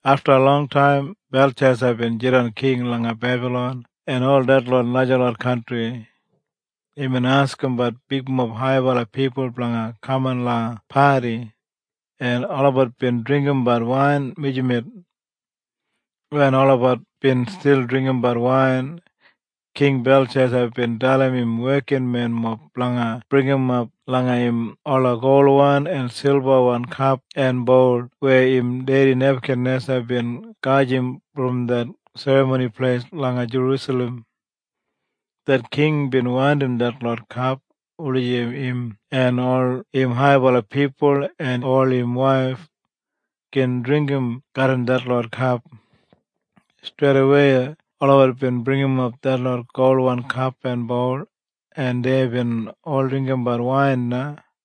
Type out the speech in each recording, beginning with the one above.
Afta longtaim Belshesa bin jidan king langa Bebalon en ol detlot najalot kantri. Imbin askimbat bigmob haibala pipul blanga kaman langa padi, en olabat bin dringgimbat wain mijamet. Wen olabat bin stil dringgimbat wain, King Belshesa bin dalim im wekinmenmob blanga bringimap langa im ola golwan en silbawan kap en boul weya im dedi Nebakanesa bin gajim brom det Serramoni Pleis langa Jerusalem. Det king bin wandim detlot kap wulijim im en ol im haibala pipul en ol im waif, gin dringgim garram detlot kap. Streidawei olabat bin bringimap detlot golwan kap en boul en deibin ol dringgimbat wain na,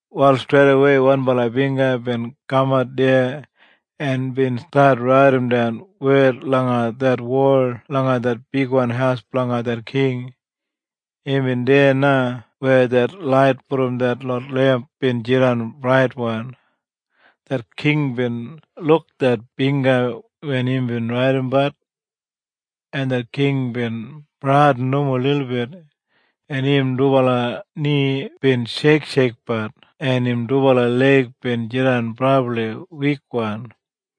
Wal streidawei wanbala bingga bin kamat deya en bin stat raidimdan wed langa det wol langa det bigwan haus blanga det king. Imbin deya na weya det lait brom detlot lemp bin jidan braitwan. Det king bin luk det bingga wen imbin raidimbat. En det king bin bradin nomo lilbit, en im dubala ni bin sheiksheikbat en im dubala leig bin jidan brabli wikwan.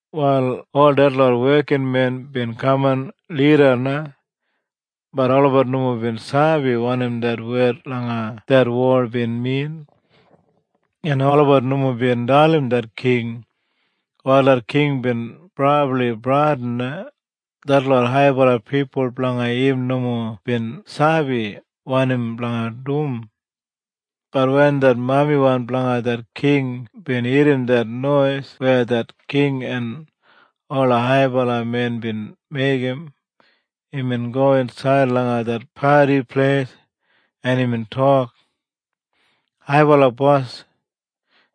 Wal ol detlot wekinmen bin kaman lida na, bat olabat nomo bin sabi wanim det wed langa det wol bin min, en olabat nomo bin dalim det king. Wal det king bin brabli bradin na. Detlot haibala pipul blanga im nomo bin sabi wanim blanga dum. Bat wen det mamiwan blanga det king bin irrim det nois weya det king en ola haibala men bin meigim, imbin go insaid langa det padi pleis, en imbin tok, “Haibala bos,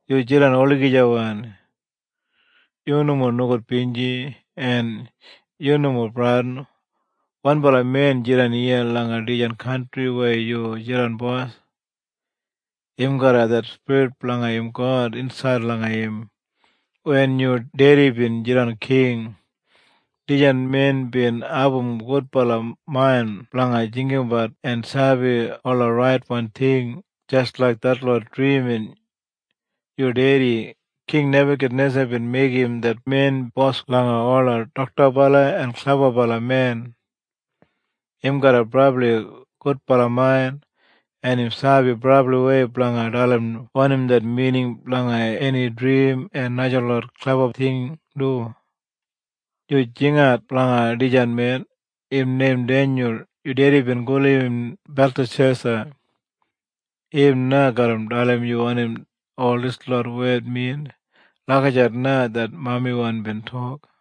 yu jidan olagijawan! Yu nomo nogudbinji, en yu nomo bradin. Wanbala men jidan iya langa dijan kantri weya yu jidan bos. Im garram det spirit blanga im God insaid langa im. Wen yu dedi bin jidan king, dijan men bin abum gudbala main blanga jinggabat en sabi ola raitwan ting, jis laik detlot drimin. Yu dedi, King Nebakanesa bin meigim det men bos langa ola doktabala en klebabala men. Im garram brabli gudbala main, en im sabi brabliwei blanga dalim wanim det mining blanga eni drim en najalot kleba ting du. Yu jingat blanga dijan men. Im neim Denyul yu dedi bin gulum im Beltashesa. Im na garra dalim yu wanim ol dislot wed min.” Lagijat na det mamiwan bin tok.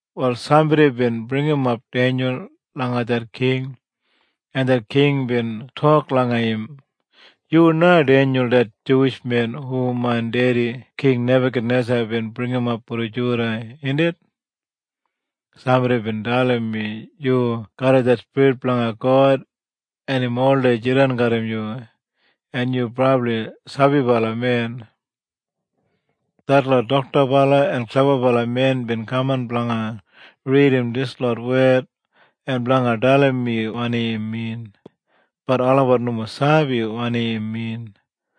Wal sambodi bin bringimap Denyul langa det king, en det king bin tok langa im, “Yu na Denyul det Juwish men hu main dedi King Nebakanesa bin bringimap brom Juda, indit? Sambodi bin dalim mi yu garram det spirit blanga God en im oldei jidan garram yu, en yu brabli sabibala men. Detlot doktabala en klebabala men bin kaman blanga ridim dislot wed, en blanga dalim mi wanim im min, bat olabat nomo sabi wanim im min.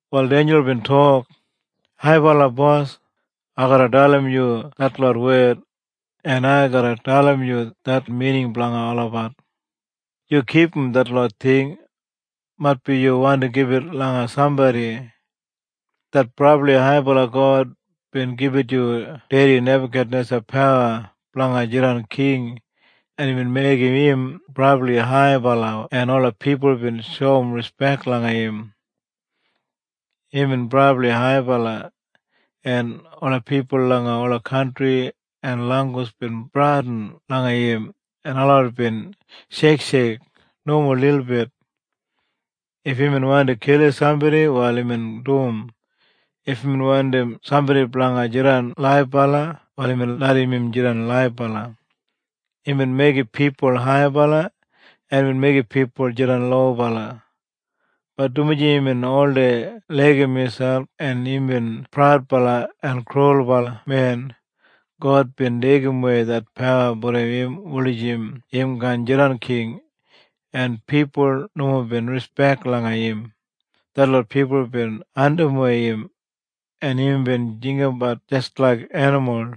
Wal Denyul bin tok, “Haibala bos, ai garra dalim yu detlot wed, en ai garra dalim yu det mining blanga olabat. Yu kipum detlot ting. Maitbi yu wandi gibit langa sambodi. Det Brabli Haibala God bin gibit yu dedi Nebakanesa pawa blanga jidan king en imbin meigim im brabli haibala en ola pipul bin shoum rispek langa im. Imbin brabli haibala, en ola pipul langa ola kantri en langgus bin bradin langa im en olabat bin sheiksheik nomo lilbit. If imbin wandim kilim sambodi wal imbin dum. If imbin wandim sambodi blanga jidan laibala wal imbin larram im jidan laibala. Imbin meigim pipul haibala en im meigim pipul jidan lobala. Bat dumaji imbin oldei laigim miselp en imbin praudbala en krulbala men, God bin deigimwei det pawa brom im wulijim im kaan jidan king, en pipul nomo bin rispek langa im. Detlot pipul bin andimwei im, en imbin jinggabat jis laik enimul.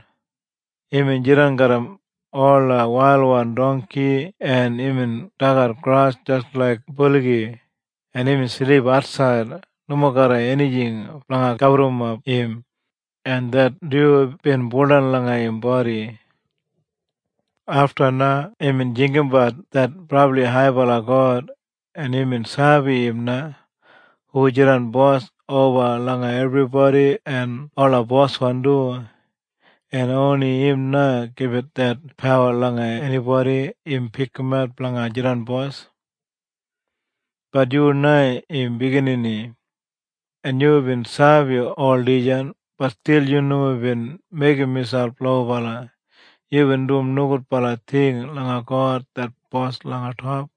Imbin jidan garram ola wailwan dongki en imbin dagat gras jis laik buligi, en imbin silip atsaid, nomo garram enijing blanga gaburrumap im, en det dyu bin buldan langa im bodi. Afta na imbin jinggabat det Brabli Haibala God, en imbin sabi im na hu jidan bos oba langa ebribodi en ola boswan du. En oni im na gibit det pawa langa enibodi im pikimat blanga jidan bos. “Bat yu na im biginini, en yubin sabi ol dijan, bat stil yu nomo bin meigim miselp lobala. Yubin dum nogudbala ting langa God det bos langa top.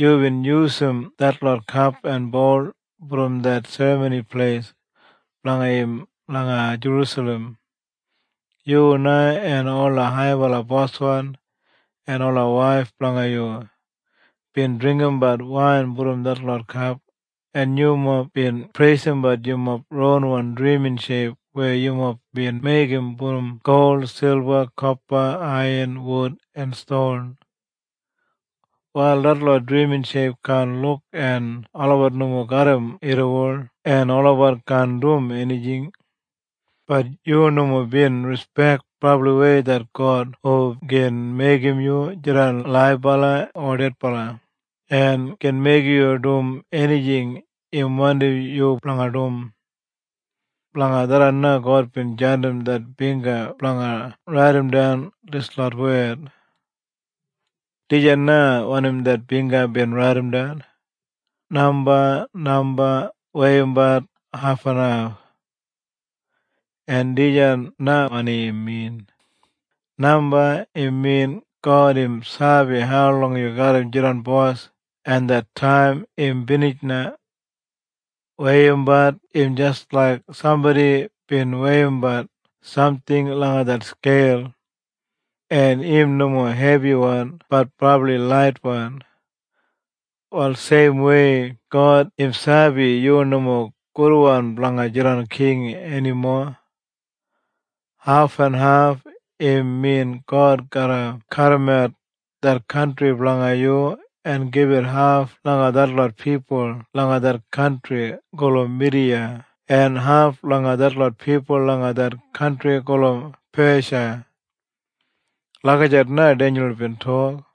Yubin yusum detlot kap en boul brom det Serramoni Pleis blanga im langa Jerusalem. Yu na en ola haibala bosmen en ola waif blanga yu, bin dringgimbat wain brom detlot kap, en yumob bin preisimbat yumob ronwan drimin sheip weya yumob bin meigim brom gol, silba, kopa, aiyan, wud en ston. Wal detlot drimin sheip kaan luk en olabat nomo garram irriwol en olabat kaan dum enijing. Bat yu nomo bin rispek brabliwei det God hu gin meigim yu jidan laibala o dedbala, en gin meigim yu dum enijing im wandim yu blanga dum. Blanga tharran na God bin jandim det bingga blanga raidimdan dislot wed. “Dijan na wanim det bingga bin raidimdan, ‘Namba, namba, weiyimbat, hafenhaf.’ En dijan na wanim im min. Namba im min God im sabi haulong yu garra jidan bos, en det taim im binij na. Weiyimbat im jis laik sambodi bin weiyimbat samting langa det skeil, en im nomo hebiwan bat brabli laitwan. Wal seimwei God im sabi yu nomo gudwan blanga jidan king enimo. Hafenhaf im min God garra kadimat det kantri blanga yu en gibit haf langa detlot pipul langa det kantri gulum Midiya en haf langa detlot pipul langa det kantri gulum Pesha.” Lagijat na Denyul bin tok.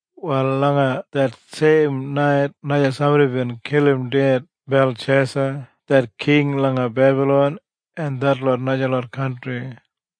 Wal langa det seim nait na sambodi bin kilim ded Belshesa det king langa Bebalon en detlot najalot kantri.